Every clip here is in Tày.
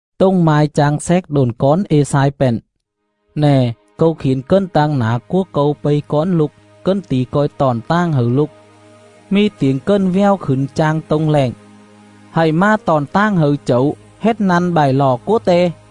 Tồng mai chang xéc độn cón Ê-xai pện: “Nè, Câu khiển cần tang nả cúa Câu pây cón Lục, Cần tỉ co̱i tọn tàng hẩư Lục.. Mì tiểng cần vèo khửn chang tô̱ng lẹng: Hạy mà tọn tàng hẩư Chẩu, Hết năn bại lọ cúa Te;” (LXX).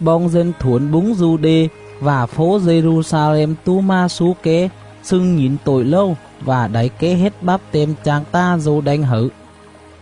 Boong dân thuổn búng Du-đê vạ fố Dê-ru-xa-lem tố mà slú ké, xưng nhỉn tội rầu vạ đảy ké hết báp-têm chang ta̱ Dô-đanh hẩư.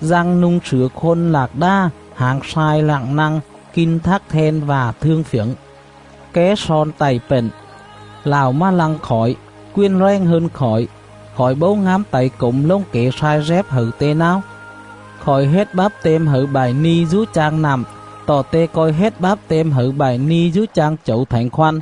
Dăng nu̱ng slửa khôn lạc đà, hảng slai rặng năng, kin thắc then vạ thương phjẩng.. Ké slon tạy pện: “Lạo mà lăng khỏi, quền rèng hơn khỏi, khỏi bấu ngám tảy cổm lồng kẻ slai dép hẩư Te náo. Khỏi hết báp-têm hẩư bại ni̱ dú chang nặm, tọ Te co̱i hết báp-têm hẩư bại ni̱ dú chang Chẩu Thảnh Khoăn.”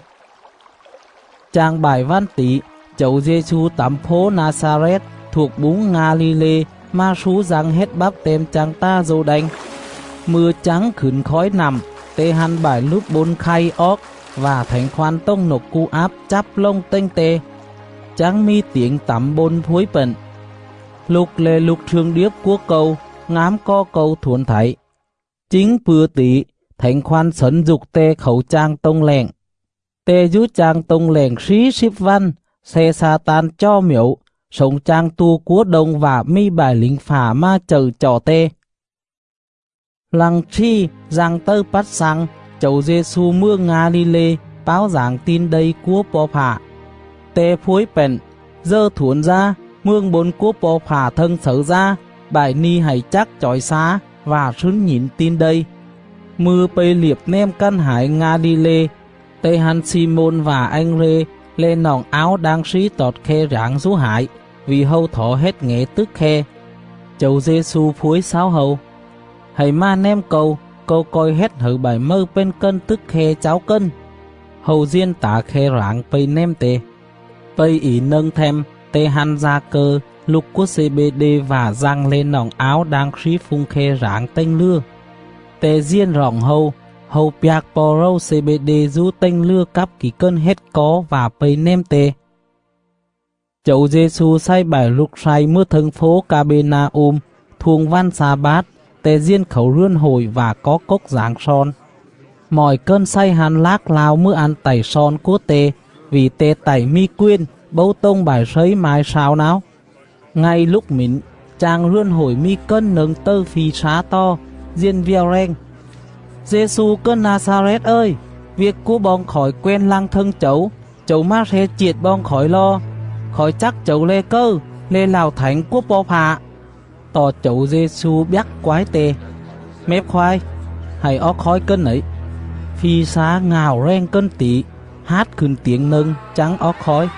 Chang bại vằn tỉ, Chẩu Dê-xu tẳm fố Na-xa-rét thuộc búng Nga-li-lê mà slú Dăng hết báp-têm chang ta̱ Dô-đanh. Mư̱a chắng khửn khói nặm, Te hăn bại lứp bôn khay oóc vạ Thảnh Khoăn tồng nộc cu áp chắp lồng tềnh Te. Chắng mì tiểng tẳm bôn phuối pện: “Lục le̱ Lục slương điếp cúa Câu, ngám cò Câu thuổn thảy!”. Chính pư̱a tỉ, Thảnh Khoăn xẩn dục Te khảu chang tô̱ng lẹng. Te dú chang tô̱ng lẹng slí slíp vằn, sle Xa-tan chò mjẩu, slổng chang tua cúa đông vạ mì bại lỉnh fạ mà chậư chọ Te. Lăng slì Dăng tầư pắt xăng, Chẩu Dê-xu mừa Nga-li-lê, páo dảng Tin Đây cúa Po̱ Fạ. Te phuối pện: “Dờ thuổn dá, mường bôn cúa Po̱ Fạ thâng xẩư dá, bại ni̱ hạy chắc chỏi xá vạ slứn nhỉn Tin Đây.”. Mư̱a pây liệp nèm cằn hải Nga-li-lê, Te hăn Xi-môn vạ Anh-rê le̱ noọng áo đang slí tọt khe rảng dú hải, vỉ hâu thỏ hết ngẻ tức khe. Chẩu Dê-xu phuối xáu hâu: “Hạy mà nèm Câu, Câu co̱i hết hẩư bại mầư pền cần tức khe cháu cần.” Hâu diền tả khe rảng pây nèm Te. Pây ỉ nâng them, Te hăn Da-cơ, lục cúa Xê-bê-đê, vạ Dăng le̱ noọng áo đang slí phung khe rảng tềnh lừa. Te diền roọng hâu. Hâu pjạc po̱ rầu Xê-bê-đê dú tềnh lừa cắp kỉ cần hết có vạ pây nèm Te. Chẩu Dê-xu xày bại lục slay mừa thâng fố Ca-bê-na-um. Thuông vằn xa-bát, Te diền khảu rườn hội vạ có cốc dảng slon. Mọi cần xày hăn lác lao mừa ăn tạy slon cúa Te, vỉ Te tạy mì quền, bấu tồng bại slấy mai slao náo.. Ngay lúc mỉn, chang rườn hội mì cần nâng tầư phi slá tò, diền vèo rèng: “Dê-xu cần Na-xa-rét ời, viêc cúa boong khỏi quen lăng thâng Chẩu? Chẩu mà sle chiệt boong khỏi lo? Khỏi chắc Chẩu le̱ cầư, le̱ Lạo Thảnh cúa Po̱ Fạ.” Tọ Chẩu Dê-xu bjắc quái te: “Mép khoái! Hạy oóc khói cần nẩy!” Phi slá ngạo rèng cần tỉ, hát khửn tiểng nâng chắng oóc khói.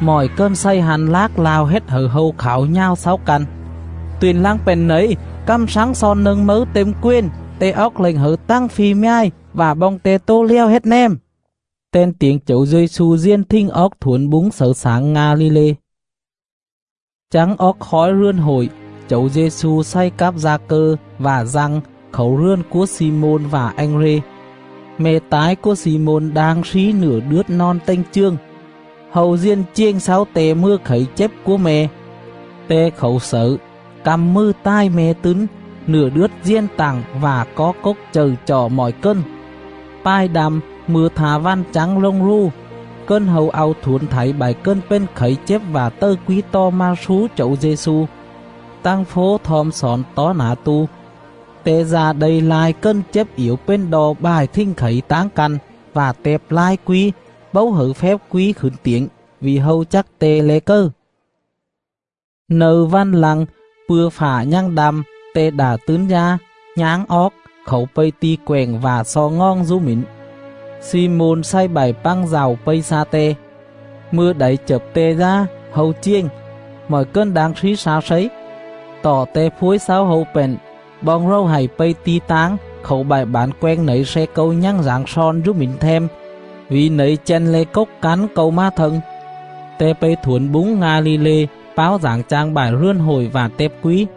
Mọi cần xày hăn lác lao hết hẩư hâu khảo nhào xáu căn: “Tuyện lăng pện nẩy? Cằm slắng slon nâng mấư têm quền! Te oóc lệnh hẩư tằng phi mjài, vạ boong te tố lèo hết nèm!” Ten tiểng Chẩu Dê-xu diền thình oóc thuổn búng xẩư xảng Nga-li-lê. Chắng oóc khói rườn hội, Chẩu Dê-xu xày cắp Da-cơ vạ Dăng khảu rườn cúa Xi-môn vạ Anh-rê. Me̱ tái cúa Xi-môn đang slí nựa đướt nòn tềnh chường. Hâu diền chiềng xáu Te mừa khẩy chếp cúa me̱. Te khảu xẩư, căm mừ tài me̱ tứn; nựa đướt diền tặng vạ có cốc chậư chọ mọi cần. Pài đăm, mư̱a tha vằn chắng lồng rù, cần hâu au thuổn thảy bại cần pền khẩy chếp vạ tầư quí tò mà slú Chẩu Dê-xu. Tằng fố thom xỏn tó nả tu. Te da đây lai cần chếp iểu pền đo bại thình khẩy táng căn, vạ tẹp lai quí, bấu hẩư fép quí khửn tiểng, vỉ hâu chắc Te le̱ cầư. Nâư vằn lăng, pư̱a fạ nhằng đăm, Te đạ tứn dá, nháng oóc, khảu pây ti̱ quẹng vạ xo ngoòng dú mỉn. Xi-môn xày bại pằng dạu pây xa Te. Mư̱a đảy chập Te dá, hâu chiềng: “Mọi cần đang slí xa Slấy.” Tọ Te phuối xáu hâu pện: “Boong rầu hạy pây ti̱ táng, khảu bại bản quenh nẩy sle Câu nhằng dảng slon dú mỉn them; vỉ nẩy chăn le̱ cốc cắn Câu mà thâng.” Te pây thuổn búng Nga-li-lê, páo dảng chang bại rườn hội vạ tẹp quí..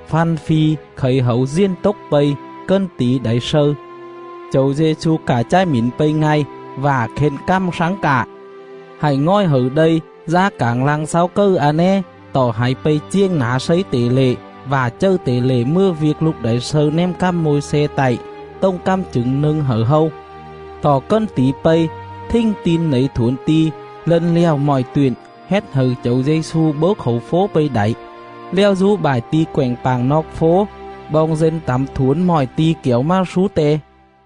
Făn fi khẩy Hẩu diền tốc pây, cần tỉ đảy slâư. Chẩu Dê-xu cạ chài mỉn pây ngay, vạ khên cằm slắng cạ: “Hạy ngòi hẩư đây, dá cảng lăng xáu cầư a né, tọ hạy pây chiềng nả slấy tể lệ, vạ chầư tể lệ mừa viêc lục đảy slâư nèm cằm Môi-xe tạy, tồng cằm chửng nâng hẩư hâu.”. Tọ cần tỉ pây, thình tin nẩy thuổn ti̱, lân lẹo mọi tuyện, hết hẩư Chẩu Dê-xu bấu khảu fố pây đảy, lèo dú bại ti̱ quẹng pạng noọc fố. Boong dân tẳm thuổn mọi ti̱ kẻo mà slú Te.